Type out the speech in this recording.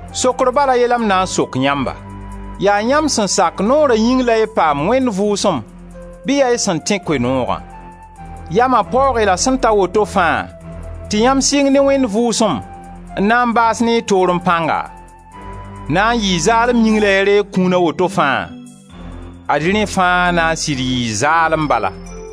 Sokr bala a ye la m na n sok yãmba: Yaa yãmb sẽn sak noora yĩng la y paam Wẽnd Vʋʋsem, bɩ yaa y sẽn tẽ Koe-nooga? Yama paoog-y la sẽn ta woto fãa tɩ yãmb sɩng ne Wẽnd Vʋʋsem n na n baas ne y toorẽ pãnga? Na n yɩɩ zaalem yĩng la y reeg kũuna woto fãa? Ad-y rẽ fãa na n sɩd yɩɩ zaalem bala!